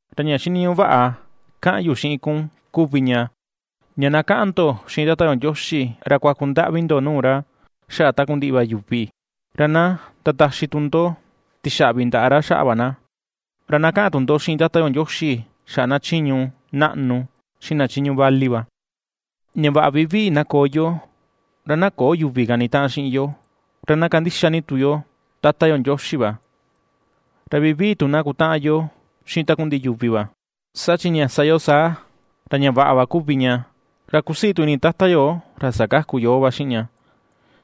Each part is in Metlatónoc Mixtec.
Ra ña xiniñuꞌu vaꞌa ^kaꞌan yu xiꞌin kun kuvi ña, ña na kaꞌan ndo xiꞌin Tata yo Ndioxi ra kuaku ndaꞌvi ndo nuu ra xaꞌa takundiꞌi va yuvi, ra na ndataxi tu ndo tixaꞌvi ndaꞌa ra xaꞌa va na. Ra na kaꞌan tu ndo xiꞌin Tata yo Ndioxi xaꞌa na chiñu naꞌnu xiꞌin na chiñu vali va, ña vaꞌa vivii na koo yo ra na köo yuvi kanitaꞌan xiꞌin yo, ra na kandixa ni tu yo Tata yo Ndioxi va, ra vivii tu na kutaꞌan yo xiꞌin takundiꞌi yuvi va. Saa chi ña sa yo saa, ra ña vaꞌa va kuvi ña, ra ^kusii tu ini Tata yo ra sakaku yoo va xiꞌin ña,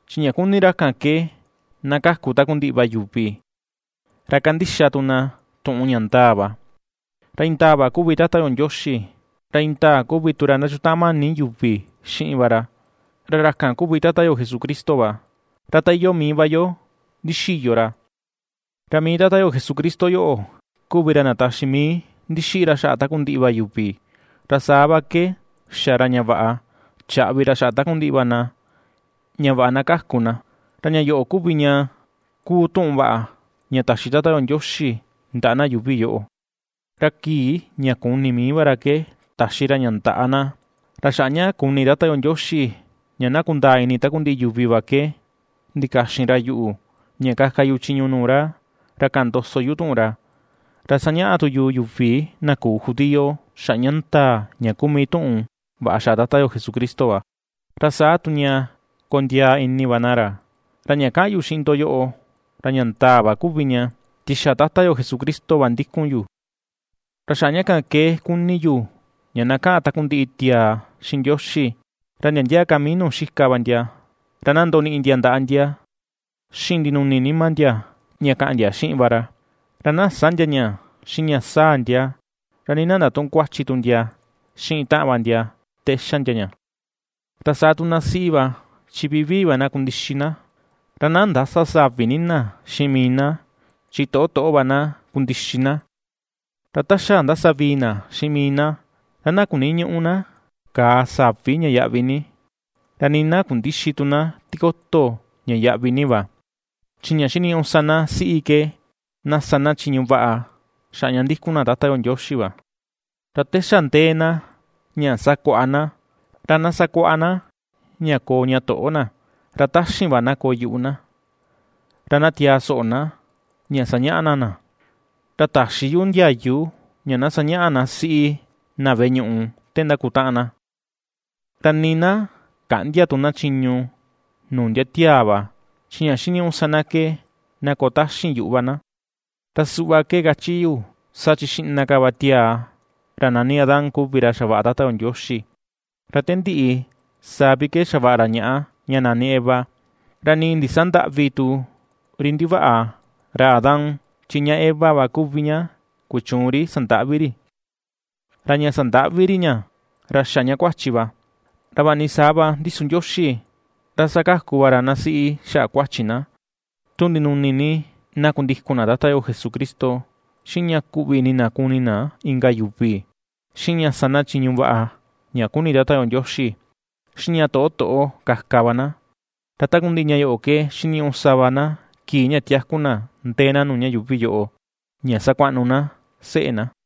chi ña kuni ra kan ke na kaku takundiꞌi va yuvi, ra kandixa tu na tuꞌun ña ndaa va. Ra indaa va kuvi Tata yo Ndioxi, ra indaa kuvi tu ra ^sandakutaꞌan mani yuvi xiꞌin va ra, ra ra kan kuvi Tata yo Jesucristo va, ra ta iyoo mii va yo ndixiyo ra. Ra mii Tata yo Jesucristo yoꞌo kuvi ra ndataxi mii ndixiꞌi ra xaꞌa takundiꞌi va yuvi, ra saa va ke xa ra ña vaꞌa chaꞌvi ra xaꞌa takundiꞌi va na ña vaꞌa na kaku na, ra ña yoꞌo kuvi ña kuu tuꞌun vaꞌa ña taxi Tata yo Ndioxi ndaꞌa na yuuvi yoꞌo, ra kii ña kuni mii va ra ke taxi ra ña ndaꞌa na. Ra xaꞌa ña kuni Tata yo Ndioxi ña na kundaa ini takundiꞌi yuvi va ke ndikaxin ra yuꞌu, ña kaka yu chiñu nuu ra, ra kaꞌan ndoso yu tuꞌun ra, ra sañaꞌa tu yu yuvi na küu judío xaꞌa ña ndaa ña kuu mii tuꞌun vaꞌa xaꞌa Tata yo Jesucristo va, ra saa tu ña kondiaa ini va na ra. Ra ña kaꞌan yu xiꞌin ndo yoꞌo, ra ña ndaa va kuvi ña, chi xa Tata yo Jesucristo va ndikun yu. Ra xaꞌa ña kan ke kuni yu ña na kaꞌan takundiꞌi tiaa xiꞌin Ndioxi, ra ndia ndia ka mii nuu xika va ndia ra na ndoniꞌi ndia ndaꞌa ndia xiꞌin ndinuni nima ndia ña kaꞌan ndia xiꞌin va ra, ra na sä ndia ña xiꞌin ña saa ndia, ra nii na ndatuꞌun kuachi tu ndia xiꞌin taꞌan va ndia te xa ndia ña. Ra saa tu na siꞌi va chi vivii va na kundixi na, ra na ndäsa savi ni na xiꞌin mii na, chi toꞌo toꞌo va na kundixi na; ra ta xa ndasavii na xiꞌin mii na, ra na kuniñüꞌu na kàà savi ña yaꞌvi ni, ra nii na kundïxi tu na tikoto ña yaꞌvi ni va, chi ña xiniñuꞌu sa na siꞌi ke na sa na chiñu vaꞌa xaꞌa ña ndikun na Tata yo Ndioxi va. Ra te xa ndee na ña sakuaꞌa na, ra na sakuaꞌa na ña koo ña toꞌo na, ra taxin va na koo yuꞌu na, ra na tiaa soꞌo na ña sañaꞌa na na. Ra täxi yu ndiayu ña na sañaꞌa na siꞌi na veꞌe ñuꞌu te ndakutaꞌan na, ra nii na käꞌndia tu na chiñu nuu ndia tiaa va chi ña xiniñuꞌu sa na ke na koo taxin yuꞌu va na. Ra suꞌva ke kachi yu, saa chi xiꞌna ka va tiaa ra nani Adán kuvi ra xavaꞌa Tata yo Ndioxi, ra te ndiꞌi saa vi xavaꞌa ra ñaꞌa, ña nani Eva. Ra nii ndisandäꞌvi tu ri ndivaꞌa ra Adán, chi ña Eva va kuvi ña kuchuun ri sandaꞌvi ri, ra ña sandaꞌvi ri ña ra xa ña kuachi va. Ra vaꞌa ni saa va ndi su Ndioxi, ra sakaku va ra na siꞌi xaꞌa kuachi na, tu ndinuni ni na kundikun na Tata yo Jesucristo, xiꞌin ña kuꞌvi ini na kuni na inka yuvi, xiꞌin ña sa na chiñu vaꞌa ña kuni Tata yo Ndioxi, xiꞌin ña toꞌo toꞌo kaka va na. Ra takundiꞌi ña yoꞌo ke xiniñuꞌu sa va na kii ña tiaku na ndee na nuu ña yuuvi yoꞌo ña sakuaꞌnu na seꞌe na.